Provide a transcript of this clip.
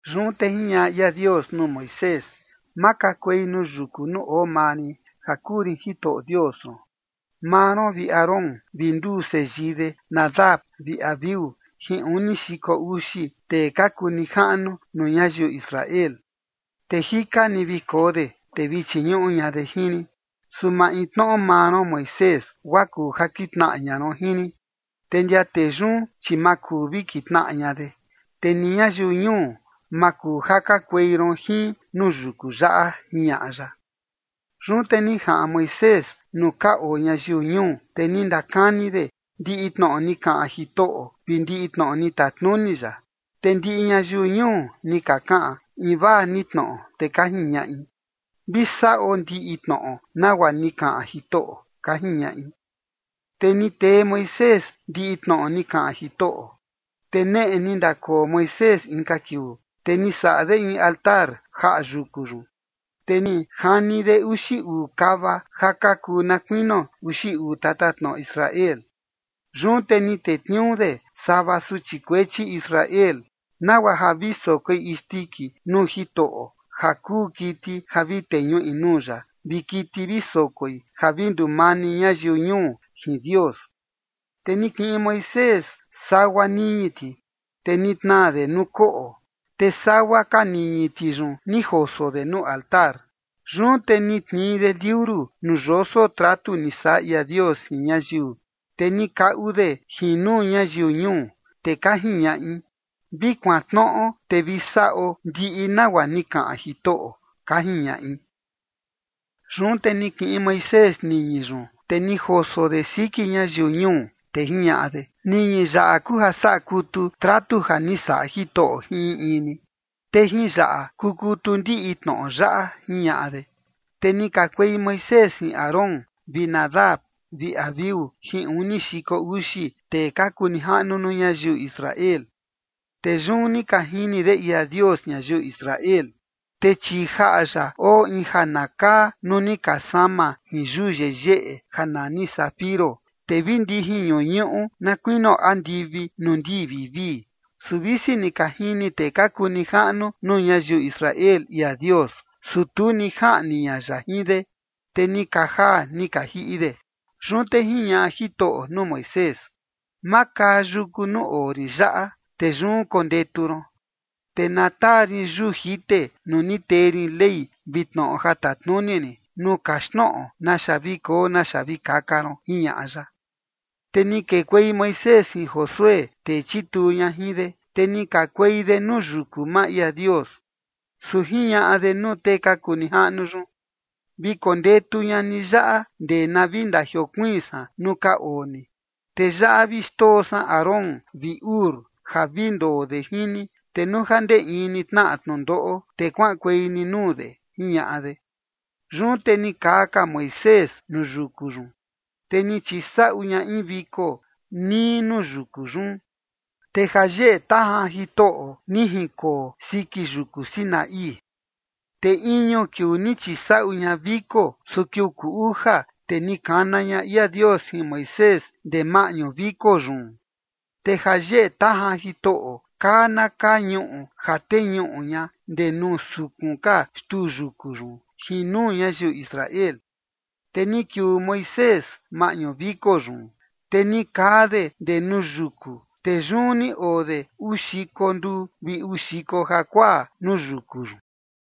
Yun te jiñaꞌa ia Dios nuu Moisés: ―Makakuei nuu yuku nuu oo maa rin ja kuu rin Jitoꞌo Dios ron, maa ron vi Aarón vi nduu seyii de, Nadab vi Abiú, jin uni xiko uxi tee ka kuu nijaꞌnu nuu ñayiu Israel, te jika ni vi koo de, te vi chiñuꞌu ña de jin rin. Su maintnoꞌo maa ron Moisés, guaa kuu ja kitnaꞌa ña ron jin rin, te ndia tee yun, chi ma kuu vi kitnaꞌa ña de, te ni ñayiu ñuu, ma kuu ja kakuei ron jin nuu yuku yaꞌa ―jiñaꞌa ya. Yun te ni jaꞌan Moisés nuu ka oo ñayiu ñuu, te ni ndakani de ndiꞌi tnoꞌo ni kaꞌan Jitoꞌo vi ndiꞌi tnoꞌo ni tatnuni ya. Te ndiꞌi ñayiu ñuu ni ka kaꞌan invaa ni tnoꞌo, te ka jiñaꞌi: ―Vi saꞌo ndiꞌi tnoꞌo nagua ni kaꞌan Jitoꞌo ―ka jiñaꞌi. Te ni tee Moisés ndiꞌi tnoꞌo ni kaꞌan Jitoꞌo. Te neꞌe ni ndakoo Moisés inka kiuu, te ni saꞌa de in altar jaꞌa yuku yun, te ni jani de uxi uu kava ja ka kuu na kuinio uxi uu tatatnoꞌo Israel. Yun te ni tetniuu de sava suchi kuechi Israel, nagua ja vi sokoi isndiki nuu Jitoꞌo ja kuu kiti ja vi teñuꞌi nuu ya, vi kiti vi sokoi ja vi ndumani ñayiu ñuu jin Dios. Te ni kiꞌin Moisés sagua niñi ti, te ni tnaa de nuu koꞌo, te sagua ka niñi ti yun ni joso de nuu altar. Yun te ni tnii de liuru nuu yoso tratu ni saꞌa ia Dios jin ñayiu, te ni kaꞌu de jin nuu ñayiu ñuu, te ka jiñaꞌi: ―Vi kuantnoꞌo te vi saꞌo ndiꞌi nagua ni kaꞌan Jitoꞌo ―ka jiñaꞌi. Yun te ni kiꞌin Moisés niñi yun, te ni joso de siki ñayiu ñuu, te jiñaꞌa de: ―Niñi yaꞌa kuu ja saꞌa kutu tratu ja ni saꞌa Jitoꞌo jin in in ni. Te jin yaꞌa kukutu ndiꞌi tnoꞌo yaꞌa ―jiñaꞌa de. Te ni kakuei Moisés jin Aarón vi Nadab vi Abiú jin uni xiko uxi tee ka kuu nijaꞌnu nuu ñayiu Israel. Te yun ni ka jini de ia Dios ñayiu Israel. Te chii jaꞌa ya oo in ja na kaa nuu ni ka sama jin yuu yeyeꞌe ja nani zafiro, te vi ndijin ñuñuꞌu na kuinio andivi nuu ndii vivii. Su visi ni ka jini tee ka kuu nijaꞌnu nuu ñayiu Israel ia Dios, su tu ni jaꞌni ña ya jin de, te ni ka jaa ni ka jiꞌi de. Yun te jiñaꞌa Jitoꞌo nuu Moisés: ―Makaa yuku nuu oo rin yaꞌa, te yun kondetu ron, te na taa rin yuu jite nuu ni tee rin ley vi tnoꞌo ja tatnuni rin, nuu kaxtnoꞌo naxa vi koo naxa vi kaka ron ―jiñaꞌa ya. Te ni kekuei Moisés jin Josué, tee chituu ña jin de, te ni kakuei de nuu yuku maa ia Dios. Su jiñaꞌa de nuu tee ka kuu nijaꞌnu yun: ―Vi kondetu ña ni yaꞌa ndee na vi ndajiokuiin san nuu ka oo ni. Te yaꞌa vi xndoo san Aarón vi Hur ja vi ndoo de jin ni. Te nuu ja ndee ni tnaꞌa in tnundoꞌo, te kuaꞌankuei ni nuu de ―jiñaꞌa de. Yun te ni kaa ka Moisés nuu yuku yun, te ni chisaꞌu ña in viko nii nuu yuku yun. Te jayeꞌe tajan Jitoꞌo ni jinkoo siki yuku Sinaí. Te iñu kiuu ni chisaꞌu ña viko, su kiuu kuu uja, te ni kana ña ia Dios jin Moisés ndee maꞌñu viko yun. Te jayeꞌe tajan Jitoꞌo kaa na kaa ñuꞌu ja teñuꞌu ña ndee nuu sukun ka xtuu yuku yun jin nuu ñayiu Israel. Te ni kiuu Moisés maꞌñu viko yun, te ni kaa de ndee nuu yuku, te yun ni oo de uu xiko nduu vi uu xiko jakuaa nuu yuku yun.